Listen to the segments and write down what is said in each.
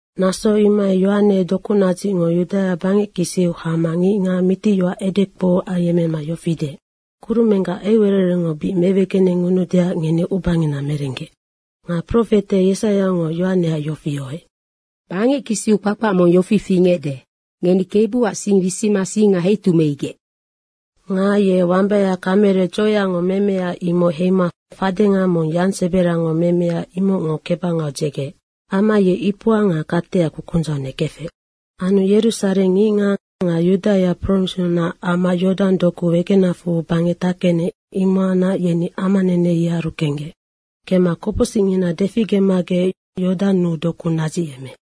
Naso imohai Yohane dokunadzicngo Yudaia bangec kisiu hama ngicngac mitiyoac edekpou ayemmema yofi deec, “Kurumenggac eucererengngo bic mewegenengunudeac ngeni ubangina merenggec.” Nga profete Yesaiango Yohaneac yofi ohoec, “Bangec kisiu kpakpac mong yofi fingecde, ‘Ngeni KEBUAC sing wisima singa heitumeigec.’” Nga ye wamba kamere dzoeango memea, imoc heima fadenga mong yangseberango memea, imocngo kebangau dzegeec. Amma ye ipua nga kateac kukundzau nekefec. Anu Yerusareng ngicngac nga Yudaia prowinsiunac amma Yodang doku wegenacfu bangec tackenec, imohacnac yeni amanene yearu kenggec. Kemma kopocsicngina deficgemagec Yodannu doku nadzicyemmeec.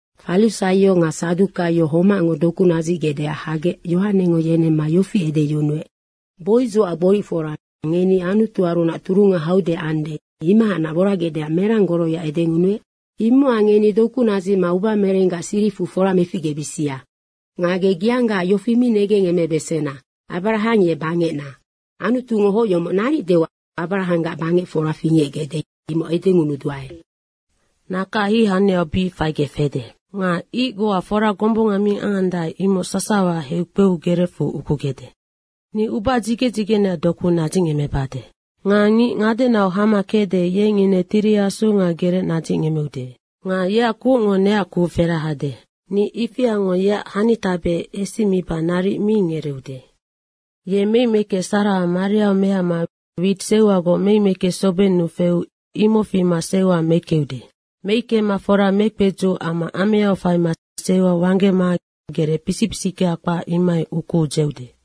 Farisaio nga sadukaio homacngo doku nadzicgecdeac hagec Yohanengo yenemma yofi edeyunuec, “Boidzocac gboricfora, ngeni Anutuarunac turunga haudeac ande, imohacnac woragecdeac merang goroyoac edengunuec? Imocac ngeni doku nadzicma ubamerenggac siricfu fora meficgebisia. Nga ge geanggaac yofi mi negengemebesena, ‘Abrahang ye bangecna.’ Anutungo hoc yomoc naric deu Abrahanggac bangecfora fingecgecdenoc, imoc edengunuduae. Naka ic haniau bic faigec fede. Nga ic goa fora gombunga mi angandae, imoc sasawa heiu kpeu gerecfu ukugecde. Ni uba dzigec dzigeneac doku nadzicngemmebade. Nga ngic ngadenau hama kecde, yeng ine Tiri Asu nga gerec nadzicngemmeude. Nga yeac kucngo neac kuc ferahade. Ni ifiango yeac hanitabe hesimiba naric mi ngereeude. Ye meic meicke saraha mariau mehama wit seuhagoc meic meicke sobennu feu imoc fima seuha meickeude. Meickema fora mekpedzuc amma ameau faima seuha wanggema gerec pisic pisickea kpac, imohai ukuu dzeude.”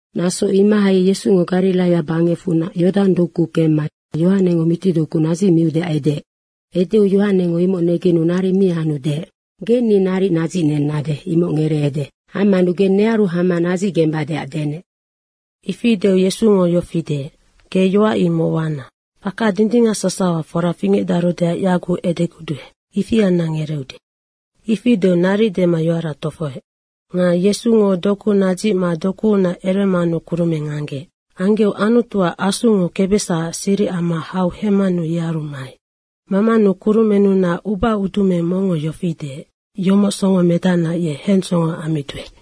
Naso imohai Yesungo Gariraia bangecfunac Yodang dokuu kemma Yohanengo mitidoku nadzicmiudeac edeec. Edeu Yohanengo imoc negenu naric mi anu deec, “Geng ni naric nadzicnennade, imoc ngereede, ammanu geng nearu hama nadzicgembadeac denec.” Ifi deu Yesungo yofi deec, “Ge yoac imoc wana, faka dindingac sasawa fora fingerudeac yaguc edeguduae, ifi anna ngereeude.” Ifi deu naric dema yoara tofohoec. Nga Yesungo doku nadzicma dokuunac eremanu kurumeng anggeec. Anggeu Anutuac Asungo kebesacac siric amma hau hemmanu yearu maec. Mamanu kurumennunac ubaudumeng mongngo yofi deec, “Yomoc songomedacna, ye hensongo ammiduae.”